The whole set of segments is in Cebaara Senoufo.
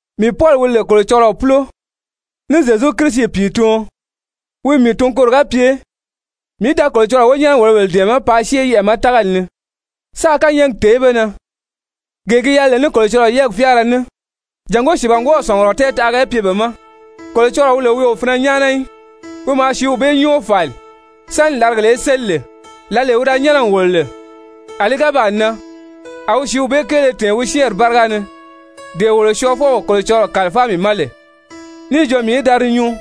Mii Pɔli, wi lè Kolocɔlɔɔ púlo ní Zyezu Kirisi pìituɔn, wi n mii tun koro ga pye mii í da Kolocɔlɔɔ wonyɛnɛ-wòlobèle dɛ̀ɛmɛ́ paa syée yɛʔɛ̀ ma tágali ni, sáā kányɛɛgi tèé be na gee gi yɛlɛ lè ní Kolocɔlɔɔ yɛ́ɛgi fyáara ní, jàngó sìibangwɔɔw sɔ̀ngurɔ tɛɛtaʔaga í pye be ma, Kolocɔlɔɔ wi lè wi o finɛ nyáana í, wi maa sìíw bee nyɔ́ɔ fàli sáni làrigèle í séli lè. Lǎlee wi da nyɛ́nɛ n wòlo lè, a li ga baa nan, a wi sìíw bee kéele tɛ̀ɛn wi syɛ́ɛnri báriga ni, dee wolo Syɔɔfɔw Kolocɔlɔɔ kàlifáa mii ma lè níì jo mii í da di nyuu.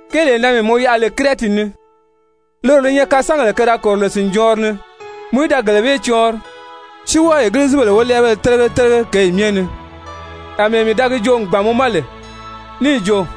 Kéelee na mii mɔ yaʔa lè Kirɛti ni, loro li nyɛ kasangèle ke da kòro lè sìnjɔɔnri ni, mɔ í da gele bee cɔɔnri, si wɔ́ɔ Egilizibèle wólɛɛbéle télege télege kěyi myɛ ni, àmɛɛ mii da gi joo n gbàn mɔ ma lè níì jo,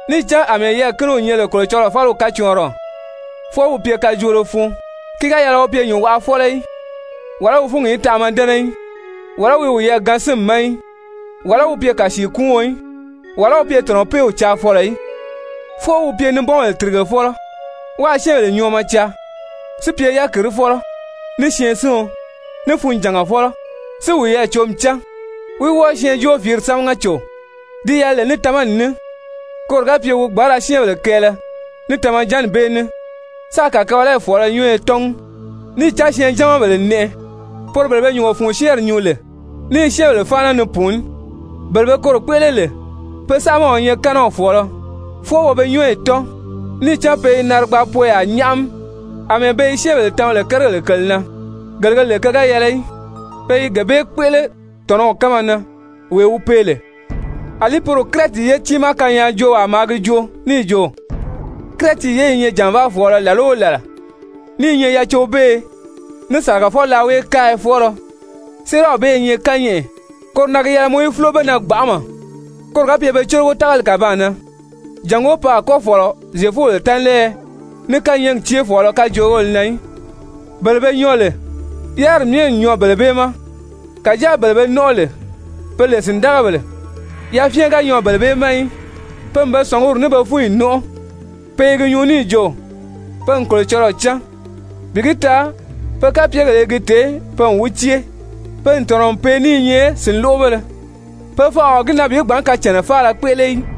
Níì cán àmɛɛ yɛɛ̀kiniw nyɛ lè Kolocɔlɔɔ fáliw kacɔɔnriɔ, fwɔɔ wi pye kajoolo fun, ki ga yɛlɛ wi pye nyùnwaʔafɔlɔ í, wàlá wi fúngi í tanʔama dɛ́nɛ í, wàlá wi wiyɛɛ gaan sínmi ma í, wàlá wi pye kàsiikuuɔn í, wàlá wi pye tɔ̀nɔpeew caafɔlɔ í. Fwɔɔ wi pye nibɔnbèle tìrigefɔlɔ, wáā syɛ́ɛnbèle nyɔɔmɔ caa, si pye yákirifɔlɔ, ní syɛɛnsiɔn, ní funjàngafɔlɔ, si wiyɛɛ cǒmi cán, wí wɔ́ɔ syɛɛnjóofiiri sámaga cò di yɛlɛ lè ní tamani ní, koro ga pye wi gbǎn ra syɛ́ɛnbèle kɛɛlɛ ní tamajanni bee ní, sáā kàkabalayi fɔ̀ɔlɔ nyɔ́ɔyɔ tɔ́ngi. Níì cán syɛɛnjamabèle n nɛʔɛ, poro bele be nyùngo fun syɛ́ɛnri nyuu lè ní i syɛ́ɛnbèle fáana ni pùuní, bele be koro kpéʔele lè, pe saamaw i nyɛ kɛ́nɛw fɔ̀ɔlɔ. Fwɔɔ wo be nyɔ́ɔyi tɔ́n, níì cán pe i narigbaapoyaa nyáʔami àmɛɛ be yi syɛ́ɛnbèle tama lè kérigèle kèle na gele ge lè ke ga yɛlɛ í, pe i gee bee kpéʔele tɔ̀nɔw kánma na wee wi pee lè. Alí poro Kirɛti ye tiimaa kanyaajoowaa maa gi joo níì jo: «Kirɛti ye i nyɛ jànvaafɔɔlɔ làla o làla, ní i nyɛ yacobeeye ní sàlagafɔ-laaweekaaya-fɔɔlɔ.» Séeraw bee i nyɛ kányɛʔɛ. Koro na gi yɛlɛ mɔ í fúlo be na gbanʔama, koro ga pye be cólogo tágali kàbaan na, jàngó pe a kɔ́ fɔ̀lɔ Zyefubèle tánlɛɛyɛ ní kányɛɛgi céefɔɔlɔ kajoogéle na í. Bele be nyɔɔ lè yáriri myɛ n nyɔɔ bele bee ma, kàjáa bele be nɔ́nʔɔ lè pe lè sìndagabèle, yafyɛn ga nyɔɔ bele bee ma í. Pe n be sɔ̀nguri ní be fúnyi nɔ́nʔɔ. Pe i gi nyuu níì jo pe n Kolocɔlɔɔ cán, bi gi taa pe kapyegèle i gi tèé pe n wi cée. Pe n tɔ̀nɔ n pee ní i nyɛ sìnloʔobéle, pe fanʔa o gi na bi gbǎn kacànnaa faala kpéʔele í.